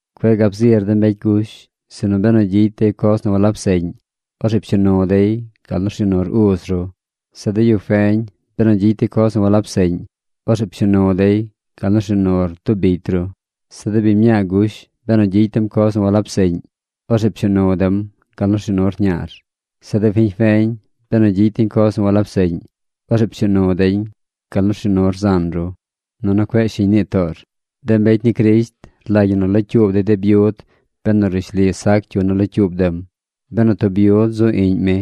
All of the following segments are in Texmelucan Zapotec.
Cueꞌ gab zir de mbecy gush, sinu benu gyicy dey coz nu walab seꞌñ, orzeꞌ pshuu nu dey gal nu rshuu nur uz ru. Zeꞌ de yu feñ, benu gyicy dey coz nu walab seꞌñ, orzeꞌ pshuu nu dey gal nu rshuu nur tub bicy ru. Zeꞌ de biñ mñaa gush, benu gyicy dem coz nu walab seꞌñ, orzeꞌ pshuu nu dem gal nu rshuu nur ñaar. Zeꞌ de fiñ feñ, benu gyicy deñ coz nu walab seꞌñ, orzeꞌ pshuu nu deñ gal nu rshuu nur zan ru. Nunu cueꞌ shiñ nii toor. De mbecy ni Crisht rlagy ñi nu locyuub yu de byud benu nu rishli sac cyu nu locyuub dem. Benu tub byud zu iꞌñ mi,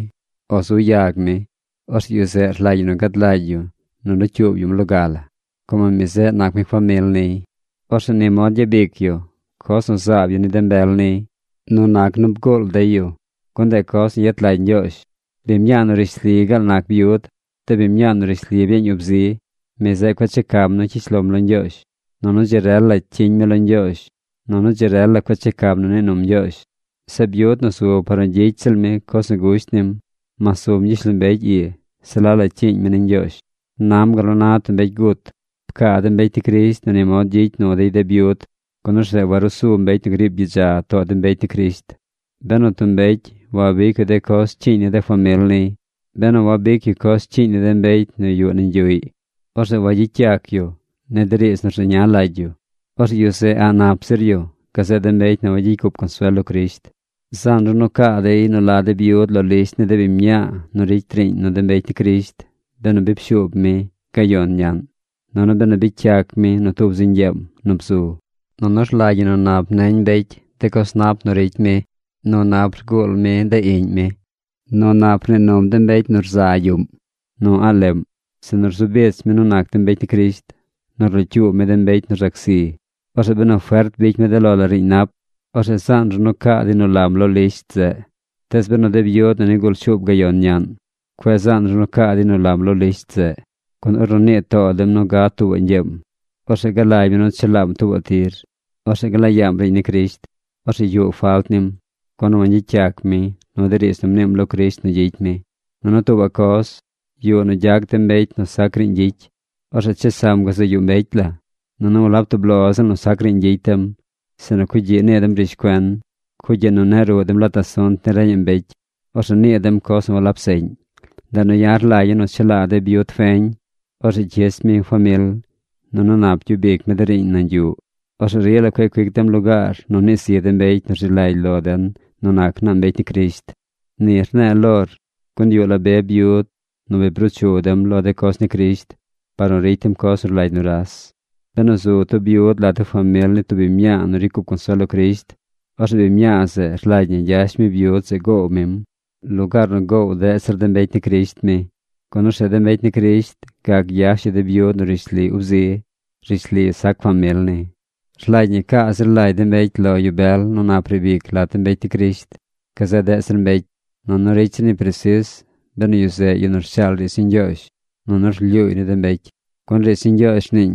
o zu yag mi, orzeꞌ yu zeꞌ rlagy ñi nu gad lagy yu nu locyuub yum loga la. Como mi zeꞌ nac mi famil niy. Orzeꞌ ni mod gyabic yu coz nu zaab yu ni de mbel niy nu nac nu bguul dey yu. Gun ndeꞌ coz nu yet lagy Ñgyoozh. Biñ mñaa nu rishli gaal nac byud, de biñ mñaa nu rishli byeeñ ub zi, mi zeꞌ cueꞌ checam nu cyish lom lo Ñgyoozh, nunu dzi rel la cyiñ mi lo Ñgyoozh. Nunu dzi rel la cueꞌ checam nu nii num Ñgyoozh. Zeꞌ byud nu zu par nu gyicy ziꞌl mi coz nu gusht nim, mas zum gyishlombecy ii, se la la cyiiñ mi ni Ñgyoozh. Nam gal nu na tub mbecy gut. Pcaa de mbecy ni Crisht nu ni mod gyicy nu dey de byud, gun orzeꞌ warusu mbecy nu griib gyidza too de mbecy ni Crisht. Benu tub mbecy wabic yu de coz cyiiñ ni de famil niy, benu wabic yu coz cyiiñ ni de mbecy nu yuꞌ nañ yuꞌy, orzeꞌ wagyicy yac yu ni de riidz nu rzeña lagy yu. Orzeꞌ yu zeꞌ a̱ꞌ nap zir yu gazeꞌ de mbecy nu wagyicy cup consuel lo Crisht. Zaan ru nu caa dey nu la de byud lo lisht ni de biñ mñaa nu ricy riiñ nu de mbecy ni Crisht benu bi pshuub mi gayon ñaꞌn, nunu benu bicy yac mi nu tub zi ñgyeem nu bzu. Nunu rlagy ñi nu nap neñ mbecy de coz nap nu ricy mi: nu nap rguul mi de iꞌñ mi, nu nap rnii num de mbecy nu rza yuꞌm, nu a̱ꞌ leꞌm, sinu rzu bich mi nu nac de mbecy ni Crisht, nu rlocyuub mi de mbecy nu rzac zi. Orzeꞌ benu fert bicy mi de lo la riiñ nap, orzeꞌ zaan ru nu caa dey nu lam lo lisht zeꞌ. Tees de byud nu nigul shuub gayon ñaꞌn, cueꞌ zaan ru nu caa dey nu lam lo lisht zeꞌ, gun ornu nii too dem nu gad tuubaꞌ ñgyeem, orzeꞌ galagy mi nu chelaam tuubaꞌ tir. Orzeꞌ gla yaam riiñ ni Crisht. Orzeꞌ yuꞌ falt nim, gun wangyicy yac mi nu de riidz nu mniim lo Crisht nu gyicy mi. Nunu tuubaꞌ coz, yuꞌ nu gyac dem mbecy nu sac riiñ gyicy. Orzeꞌ chesam gazaꞌ yuꞌ mbecy la. Nunu walab tub lo ziꞌl nu sac riiñ gyicy dem, sinu cugyiꞌ nii dem rishcuen. Cugyiꞌ nu neꞌ ruꞌ dem lat asunt ni reñaꞌ mbecy. Orzeꞌ nii dem coz nu walab seꞌñ. Ndeꞌ nu ya̱ rlagya̱ nu chelaa de byud feñ. Orzeꞌ cyich mi famil, nunu nap gyub ic mi de riiñ nañ yuꞌ. Orzeꞌ rila cueꞌ cuic dem lugaar nu nii zi de mbecy nu rzi lagy lo den nu nac naa mbecy ni Crisht. Ni rne̱e̱ lor, gun yuꞌ la be byud nu bi bruu chu dem lo de coz ni Crisht par nu ricy dem coz nu rlagy nuras. Benu zu tub byud lat de famil ni tub biñ mñaa nu ricy cup consuel lo Crisht, orzeꞌ biñ mñaa zeꞌ rlagy ñi gyash mi byud zeꞌ goow mim lugaar nu goow deꞌ zir de mbecy ni Crisht mi, gun orzeꞌ de mbecy ni Crisht gac gyash yu de byud nu rishli ub zi, rishli sac famil ni. Rlagy ñi nu ca zir lagy de mbecy lo yu bel nu nap riib ic lat de mbecy ni Crisht gazeꞌ deꞌ zir mbecy. Nunu ricy zir ñi presis benu yu zeꞌ yu nu rshaal riidz ni Ñgyoozh nunu rlyuuy ni de mbecy. Gun riidz ni Ñgyoozh rniiñ: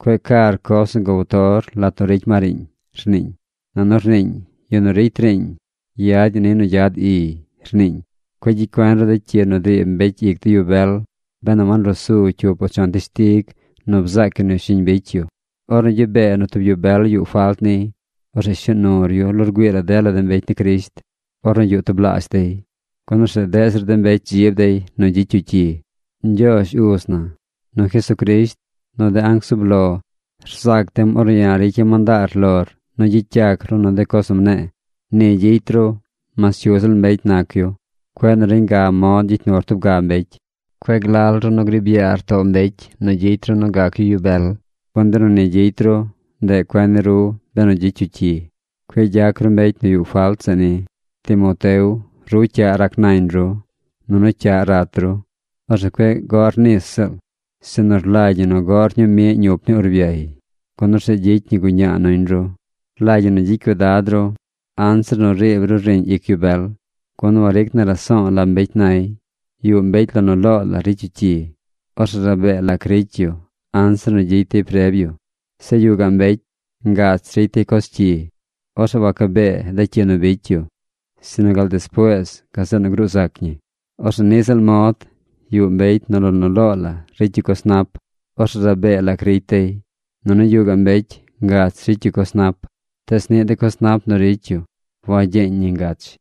“Cueꞌ car coz nu gow tor lat nu ricy ma riiñ”, rniiñ. Nunu rniiñ: “Yu nu ricy riiñ yad ñi nu gyad iy”, rniiñ. Cueꞌ gyicy cuen ru de cyi nu driib mbecy ic de yu bel benu wanrusu cyup o chon teshtig nu bzaac yu nu shiñ bicy yu. Ornu gyubee nu tub yu bel yuꞌ falt niy, orzeꞌ shuu nur yu lo rgüii la dela de mbecy ni Crisht ornu yuꞌ tublaazh dey, gun orzeꞌ deꞌ zir mbecy dzib dey nu gyicy yu cyi. Ñgyoozh Uz na, nu Jesucrisht, nu de anc zub lo rzac dem ornu ya̱ ricya̱ mandaar lor nu gyicy yac ru nu de coz nu mne̱e̱. Ni gyicy ru mas cyu ziꞌl mbecy nac yu. Cueꞌ nu reñ ga mod gyicy nur tub ga mbecy. Cueꞌ glal ru nu griib yaar too mbecy nu gyicy ru nu gac yu yu bel. Gun benu ni gyicy ru, ndeꞌ cuen ni ru benu gyicy yu cyi. Cueꞌ gyac ru mbecy nu yuꞌ falt zeꞌ ni. Timoteo, ru cyaꞌ rac nañ ru, nunu cyaꞌ rat ru. Orzeꞌ cueꞌ goꞌr nis ziꞌl, sinu rlagy ñi nu goꞌr ñuu miꞌ ñup ni urbyay, gun orzeꞌ gyicy ñi guñaa nuñ ru. Rlagy ñi nu gyicy cuidad ru anzir nu riib ru riiñ ic yu bel, gun waric na raso̱o̱ la mbecy nay. Yuꞌ mbecy lo nu loo la ricy yu cyi. Orzeꞌ rabee lac ricy yu anzir nu gyicy der preb yu. Zeꞌ yuꞌ gaꞌ mbecy ngach ricy dey coz cyi. Orzeꞌ waca bee de cyi nu bicy yu, sinu gal despuees gazeꞌ nu gruu zac ñi. Orzeꞌ niꞌ ziꞌl mod yuꞌ mbecy nu lo nu loo la ricy yu coz nap. Orzeꞌ rabee lac ricy dey. Nunu yuꞌ gaꞌ mbecy ngach ricy yu coz nap. Tees niꞌ de coz nap nu ricy yu wagyeñ ñi ngach.